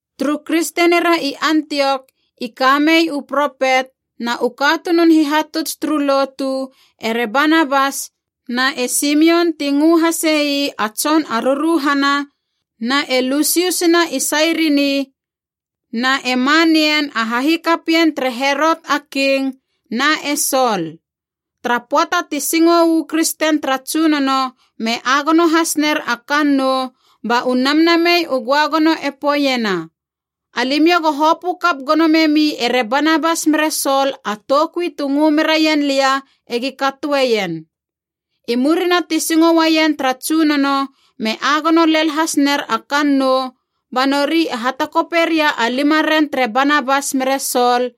Turu kristenira i Antiok i kamei u propet na u katunun hihatuts turu lotu, ere Banabas, na e Simion ti ngö hasei a tson a ruruhana, na e Lusius na i Sairini, na e Manaen a hahikapien tere Herot a King, na e Sol. Tara pöata ti singou u kristen tara Tsunono me agono has ner a kannou, ba u Namnamei u Göagono e poeiena, “Alimiou go hopö kap gono memi ere Banabas mere Sol a toukui tu ngö meraien lia egi katoeien.” I murina ti singo uaien tara Tsunono me agono lel has ner a kannou, ba nori e hatakope ria a limaren tere Banabas mere Sol,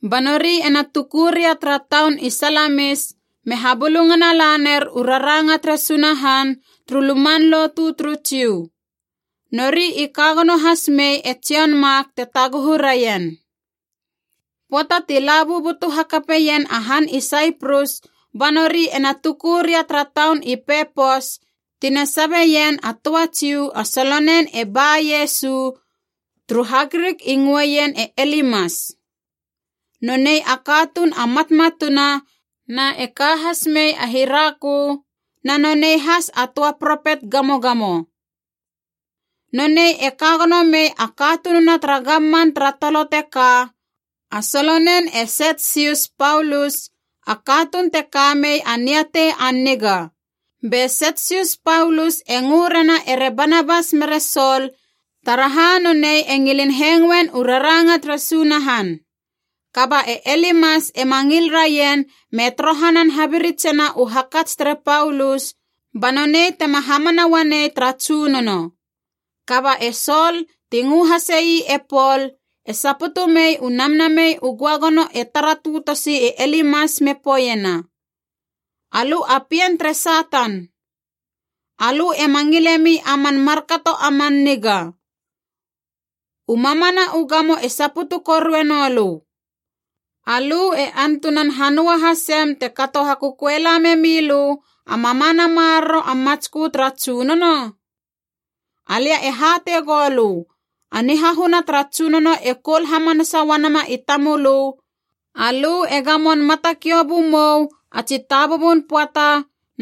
Ba nori ena tuku ria tara taun i Salamis me habulungana laner u raranga tere Sunahan turu luman lotu turu Jiu. Nori i ka gono has mei e Jon Mak te taguhu raien. Pöata ti la bubutu hakapeien a han i Saiprus, ba nori ena tuku ria tara taun i Pepos, tina sabeien a töa Jiu a solonen e Ba-Iesu (turu HaGrik i ngöeien e Elimas). Nonei a katuun a matmatuna na e ka has mei a hirakö, na nonei has a töa propet gamogamo. Nonei e ka gono mei a katununa tara gamman tara tolo teka, a solonen e Setsius Paulus, a katuun te ka mei a niatei a niga. Be Setsius Paulus e ngö rena ere Banabas mere Sol, taraha nonei e ngilin hengoen u raranga tere Sunahan. Kaba e Elimas ema ngil raien me torohanan habiritsena u hakats tere Paulus ba nonei tema hamana uanei tara Tsunono. Kaba e Sol, ti ngö hase ii e Pol, e saputu mei u Namnamei u Göagono e tara tötosi e Elimas me poeiena, “Alö a pien tere Satan! Alö ema ngilemi a man markato a man niga! U mamana u gamo e saputu korue nolö! Alö e antunan hanöa hasem te kato hakököela memilö a mamana maroro a matskö tara Tsunono? Alia e hatei goulö, a nihahuna tara Tsunono e koul hamanasa uanama i tamölö, alö e gamon matakiou bumou a tsi tabubun pöata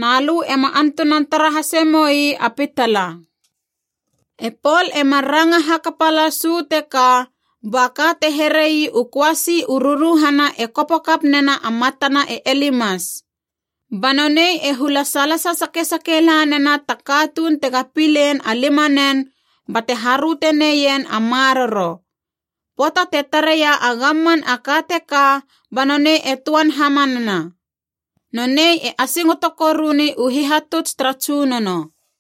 na lö ema antunan tara hase moi a pitala!” E Pol e mar ranga hakapa las uu teka, ba ka te here ii u köasi u ruruhana e kopo kap nena a matana e Elimas. Ba nonei e hula salasa sakesake lanena ta katuun tega pilein a limanen bate haröte neien a maroro. Pöata te tareia e gamman a ka teka ba nonei e töan hamanana. Nonei e asingoto koruni u hihatuts tara Tsunono.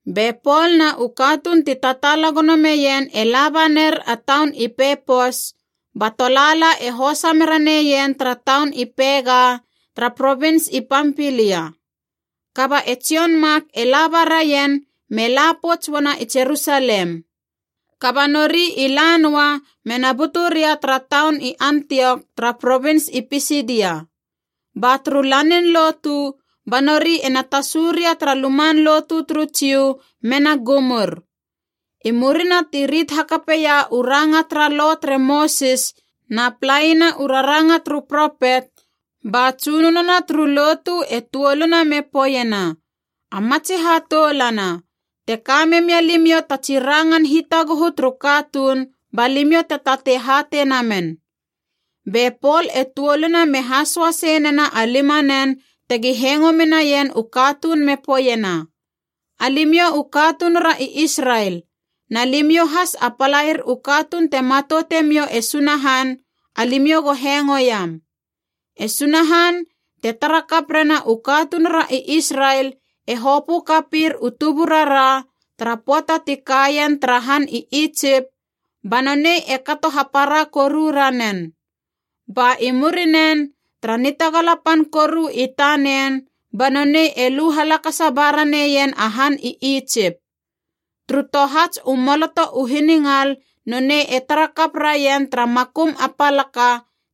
Be Pol na u katuun ti tataala gono meien e laba ner a taun i Pepos, ba tolaala e hosa mera neien tara taun i Pega tara provins i Pampilia. Kaba e Jon Mak e laba raien me la pouts uana i Jerusalem. Kaba nori i la noa mena butu ria tara taun i Antiok tara provins i Pisidia. Ba turu lanin lotu ba nori ena tasu ria tara luman lotu turu Jiu, mena gumur. I murina ti rit hakapeia u ranga tara Lo tere Mosis na palaina u raranga turu propet, ba tsunono na turu lotu e tuoluna me poeiena, “A matsi hatoulana, te ka memia limiou ta tsi rangan hitaguhu turu katuun, ba limiou te tatei hatei namen.” Be Pol e tuoluna me hasoasei nena a limana tegi hengo menaien u katuun me poeiena: “Alimiou u katunura i Israel, na limiou has a palair u katuun te matoute miou e Sunahan, alimiou go hengoiam. E Sunahan, te tara kap rena u katunura i Israel, e hopö kapir u tuburara, tara pöata ti kaien tara han i Itsip, ba nonei e kato hapara koru ranen. Ba i murinen, tara nitagala pan koru i tanen, ba nonei e lu halakasa ba raneien a han i Itsip. Turu tohats u maloto u hiningal nonei e tara kap raien tara makum a palaka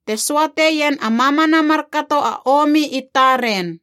te söateien a mamana markato a omi i taren.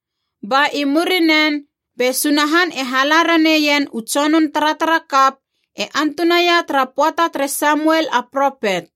“Ba i murinen be Sunahan e hala raneien u tsonun taratarakap e antunaia tara pöata tere Samuel a propet.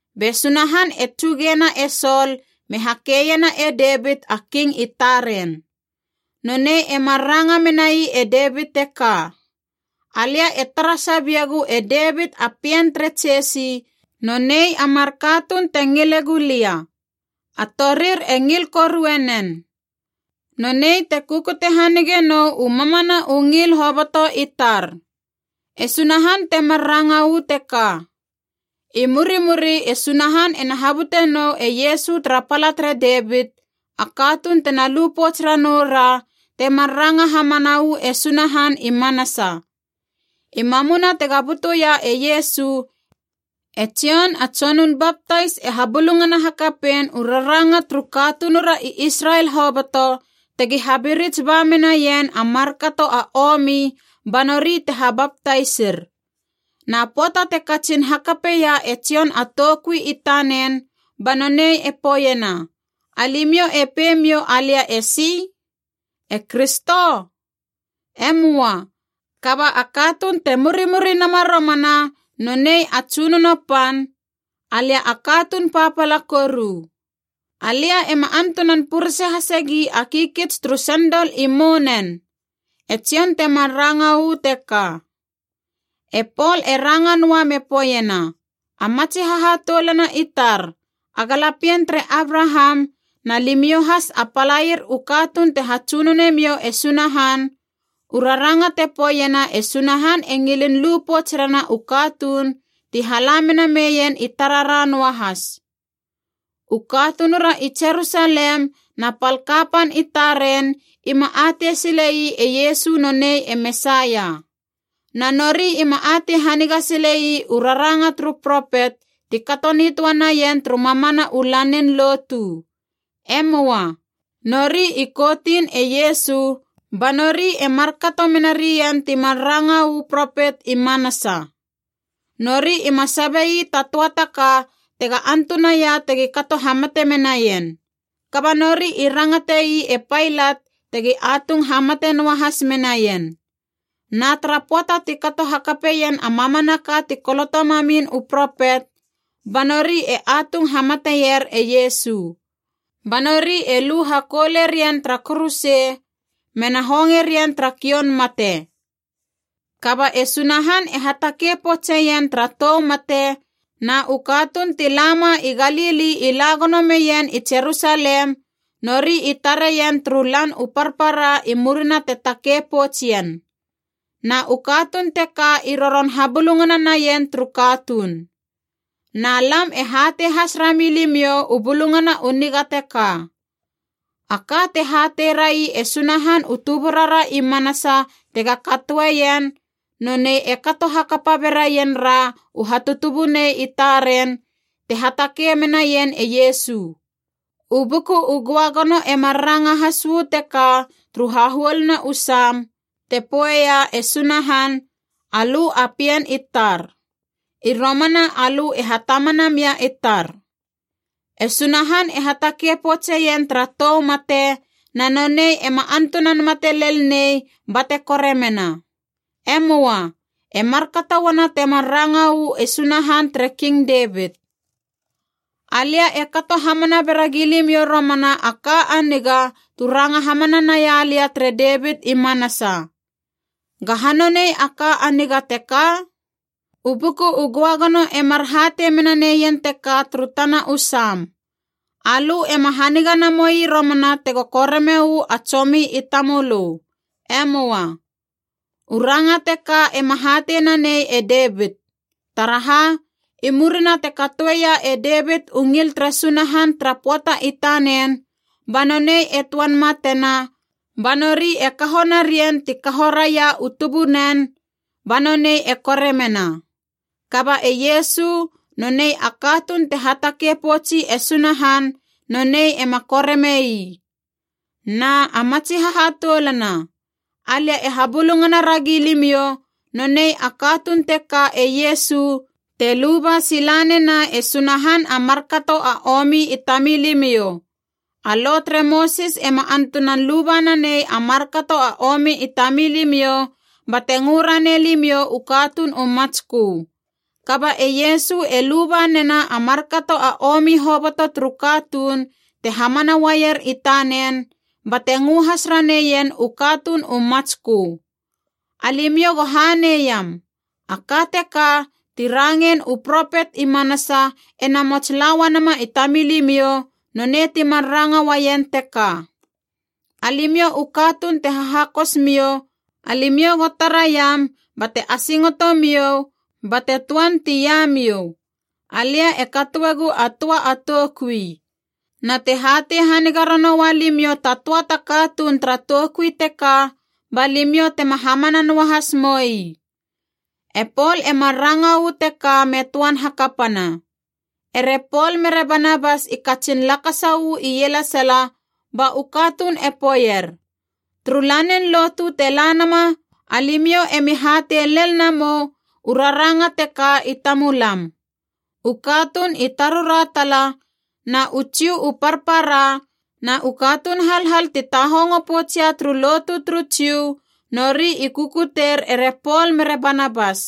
Be Sunahan e tsugena e Sol me hakeiena e Devit a king i taren. Nonei e mar ranga menai e Devit teka: ‘Alia e tara sabiegu e Devit a pien tere Jesi nonei a mar katuun te ngile gulia. A torir e ngil korue nen. Nonei te kukute hanige nou u mamana u ngil hoboto i tar.’ E Sunahan temar ranga uu teka. I murimuri e Sunahan ena habute nou e Iesu tara pala tere Devit, a katuun tena lu pouts ranoura temar ranga hamana uu e Sunahan i manasa. I mamuna tega butuia e Iesu, e Jon a Tsonun Baptais e habulungana hakapein u raranga turu katunura i Israel hoboto tegi habirits ba menaien a markato a omi ba nori te habaptaisir. Na pöata te katsin hakapeia e Jon a toukui i tanen, ba nonei e poeiena, ‘Alimiou e pei miou alia esi? E Kristo? E möa. Kaba a katuun te murimuri nama romana, nonei a Tsunono pan, alia a katuun papala koru. Alia ema antunan purese hasegi a kikits turu sendol i mounen,’ E Jon temar ranga uu teka.” E Pol e ranga noa me poeiena, “A matsi hahatoulana i tar a galapien tere Abraham, na limiou has a palair u katuun te hatsunone miou e Sunahan, u raranga te poeiena e Sunahan e ngilin lu pouts rena u katuun ti hala mena meien i tarara noahas. U katunura i Jerusalem na pal kapan i taren ima atei sile ii e Iesu nonei e Mesaia. Na nori ima atei haniga sile ii u raranga turu propet ti kato nitöa naien turu mamana u lanin lotu. E möa. Nori i koutin e Iesu ba nori e markato mena rien ti mar ranga uu propet i manasa. Nori ima sabe ii ta töa ta ka tega antunaia tegi kato hamate menaien. Kaba nori i rangate ii e Pailat tegi atung hamate noahas menaien. Na tara pöata ti kato hakapeien a mamanaka ti koloto mamin u propet, ba nori e atung hamateier e Iesu. Ba nori e lu hakoule rien tara kuruse, mena honge rien tara kioun mate. Kaba e Sunahan e hatakei poutseien tara tou mate, na u katuun ti la ma i Galili i la gono meien i Jerusalem, nori i tareien turu lan u parpara i murina te takei pouts ien. Na u katuun teka i roron habulungana naien turu katuun. “Na lam e hatei has rami limiou u Bulungana u Niga teka. A ka te hateirai e Sunahan u tuburara i manasa tega katoeien, nonei e kato hakapa beraien ra u hatutubunei i taren, te hatakei menaien e Iesu. U Buku u Göagono e mar ranga has uu teka turu hahuoluna u Sam, te poeia e Sunahan, ‘Alö a pien i tar. I romana alö e hatamana mia i tar.’ “E Sunahan e hatakei poutseien tara tou mate, na nonei ema antunan mate lel nei bate koremena. E möa. E markato uana temar ranga uu e Sunahan tere King Devit: ‘Alia e kato hamana bera gilimiou romana a ka a niga tu ranga hamana naia lia tere Devit i manasa.’ “Gaha nonei a ‘ka a niga’ teka? U Buku u Göagono e mar hatei mena neien teka turu tana u Sam, ‘Alö ema haniga namoi romana tego koreme uu a tsomi i tamölö. E möa.’ “U ranga teka ema hatei nanei e Devit. Taraha, i murina te katoeia e Devit u ngil tere Sunahan tara pöata i tanen, ba nonei e töan matena ba nori e kaho narien ti kaho raia u tubunen, ba nonei e koremena. Kaba e Iesu, nonei a katuun te hatakei poutsi e Sunahan, nonei ema koreme ii. “Na, a matsi hahatoulana, alia e habulungana ragi limiou, nonei a katuun teka e Iesu te luba sila nena e Sunahan a markato a omi i tamilimiou. A Lo tere Mosis ema antunan luba nanei a markato a omi i tamilimiou bate ngö ranei limiou u katuun u matskö. Kaba e Iesu e luba nena a markato a omi hoboto turu katuun te hamana uaier i tanen, bate ngö has raneien u katuun u matskö. Alimiou go hanei iam! A ka teka, ti rangein u propet i manasa e namots la uanama i tamilimiou nonei ti mar ranga uaien teka: ‘Alimiou u katuun te hahakosmiou, alimiou go taraiam, bate asingoto miou, bate töan tiamiou! Alia e katoegu a töa a toukui. Na te hatei haniga ranoua limiou ta töa ta katuun tara toukui teka, ba limiou tema hamana noahas moi.’” E Pol e mar ranga uu teka me töan hakapana. Ere Pol mere Banabas i katsin lakasa uu ielesala ba u katuun e poeier, “Turu lanin lotu te la nama alimiou emi hatei lel namou u raranga teka i tamulam.” U katuun i tarura tala, na u Jiu u parpara na u katuun halhal ti tahongo poutsia turu lotu turu Jiu, nori i kukuteir ere Pol mere Banabas.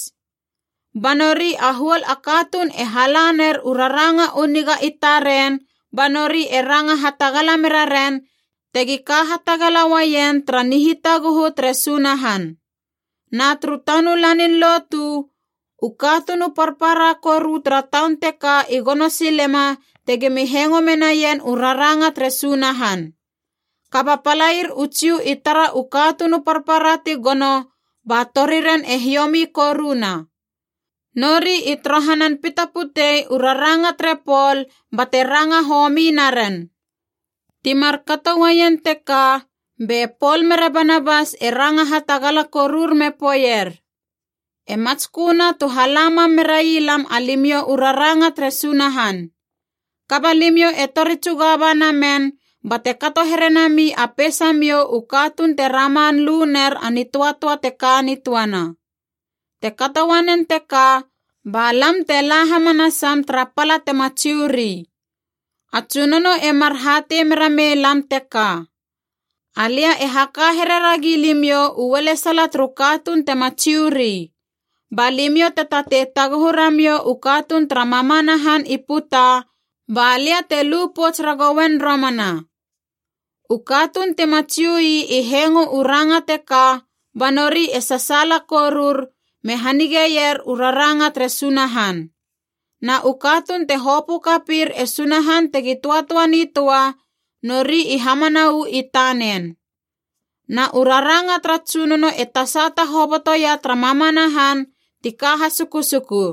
Ba nori a huol a katuun e hala ner u raranga u niga i taren ba nori e ranga hatagala mera ren tegi ka hatagala uaien tara nihitaguhu tere Sunahan. Na turu tanu lanin lotu, u katuun u parpara koru tara taun teka i gono silema tegimi hengo menaien u raranga tere Sunahan. Kaba palair u Jiu i tara u katuun u parpara ti gono, ba toriren e hiomi koruna. Nori i torohanan pita putei u raranga tere Pol bate ranga homi naren. Ti markato uaien teka be Pol mere Banabas e ranga hatagala korur me poeier, “E matsköna tu hala mam merai lam alimiou u raranga tere Sunahan. Kaba limiou e tori tsuga ba namen bate kato here nami a peisamiou u katuun te raman lu ner a nitöatöa te ka nitöana. Te kato uanen teka ba lam te la hamanasam tara pala tema Jiu ri. A Tsunono e mar hatei mera mei lam teka: ‘Alia e haka here ragi limiou u ualesala turu katuun tema Jiu ri. Ba limiou te tatei taguhu ramiou u katuun tara mamana han i puta, ba lia te lu pouts ragouen romana.’” U katuun tima Jiui i hengo u ranga teka, ba nori e sasaala korur, me hanigeier u raranga tere Sunahan. Na u katuun te hopö kapir e Sunahan tegi töatöa nitöa, nori i hamana uu i tanen. Na u raranga tara Tsunono e tasata hobotoia tara mamana han ti ka hasukusuku.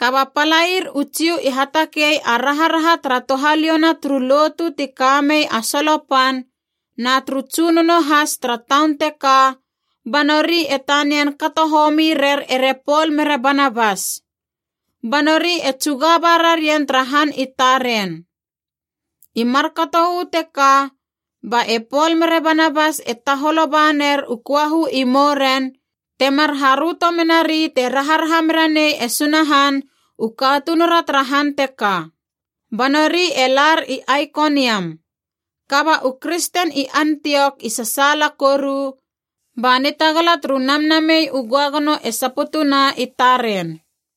Kaba palair u Jiu i hatakei a raharaha tara touhaliouna turu lotu ti ka mei a solo pan, na turu tsunono has tara taun teka, ba nori e tanian kato homi rer ere Pol mere Banabas. Ba nori e tsuga ba rarien tara han i taren. I markato uu teka, ba e Pol mere Banabas e taholo ba ner u köahu i mouren, temar haröto menari te raharaha mera nei e Sunahan u katunura tara han teka. Ba nori e lar i Aikoniam. Kaba u kristen i Antiok i sasaala koru, ba nitagala turu Namnamei u Göagono e saputuna i taren.